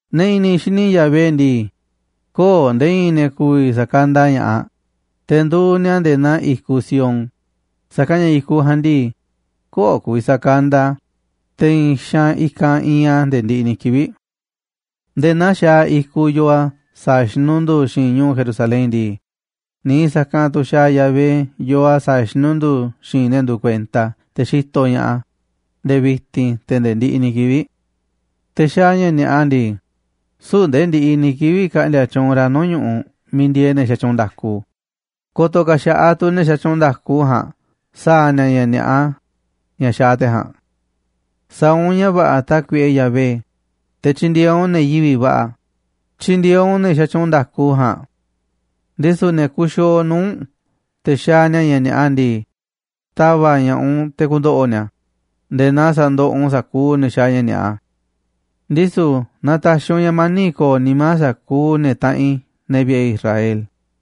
Ne̱ i̱ni̱ xini Yahvé ndii, köo̱ꞌ nde̱e̱ i̱i̱n ne̱ ku̱vi̱ sa̱kanda ña̱ꞌaꞌ, te̱ nduuꞌ ni̱a̱ nde̱e̱ naa i̱kuꞌ Sión, sa̱kanꞌ ña̱ i̱kuꞌ ja̱a̱nꞌ ndii, köo̱ꞌ ku̱vi̱ sakanda a̱, te̱ i̱i̱n xaanꞌ i̱kanꞌ iinꞌ a̱ nde̱e̱ ndiꞌiꞌ ni̱ kivi̱ꞌ. Nde̱e̱ naa xaaꞌ i̱kuꞌ yoo a̱ sa̱a̱ xinundu̱u̱ xi̱i̱nꞌ ñu̱u̱ Jerusalén ndii, niiꞌ sa̱kanꞌ tu̱ xaaꞌ Yahvé yoo a̱ sa̱a̱ xinundu̱u̱ xi̱i̱nꞌ ne̱ nduuꞌ kuenta a̱, te̱ xitoꞌ ña̱ꞌaꞌ a̱ nde̱e̱ vi̱ti̱n te̱ nde̱e̱ ndiꞌiꞌ ni̱ kivi̱ꞌ. Te̱ xaaꞌ ña̱ ni̱a̱ꞌa ndii, süu̱ꞌ nde̱e̱ ndiꞌiꞌ ni̱ kivi̱ꞌ ka̱ꞌndi̱a̱ tyuunꞌ ra̱ nuu̱ꞌ ñu̱ꞌuꞌ miiꞌ ndieeꞌ ne̱ xatyuunꞌ nda̱ku, ko̱to̱ ka̱ xa̱ꞌaꞌ tu̱ ne̱ xatyuunꞌ nda̱ku ja̱a̱nꞌ sa̱a̱ ni̱a̱ ña̱ ni̱a̱ꞌa ña̱ xaaꞌ te̱ ja̱a̱nꞌ. Sa̱a̱ u̱nꞌ ña̱ va̱ꞌa̱, Tákuiꞌe Yahvé, te̱ tyi̱ndi̱e̱eꞌ u̱nꞌ ne̱ yivi̱ꞌ va̱ꞌa̱. Tyi̱ndi̱e̱eꞌ u̱nꞌ ne̱ xatyuunꞌ nda̱ku ja̱a̱nꞌ. Ndisu̱ ne̱ kuxiooꞌ nuu̱ꞌ u̱nꞌ te̱ xaaꞌ ni̱a̱ ña̱ ni̱a̱ꞌa ndii, ta̱va̱ꞌ ña̱ꞌaꞌ u̱nꞌ te̱ ku̱ndo̱ꞌo̱ ni̱a̱ nde̱e̱ naa sa̱ndoꞌoꞌ u̱nꞌ sa̱kuuꞌ ne̱ xaaꞌ ña̱ ni̱a̱ꞌa. Ndisu̱ na ta̱xi̱ u̱nꞌ ña̱ mani̱ꞌ ko̱o̱ nimá sa̱kuuꞌ ne̱ taꞌanꞌ i̱, ne̱ vi̱ꞌe̱ Israel.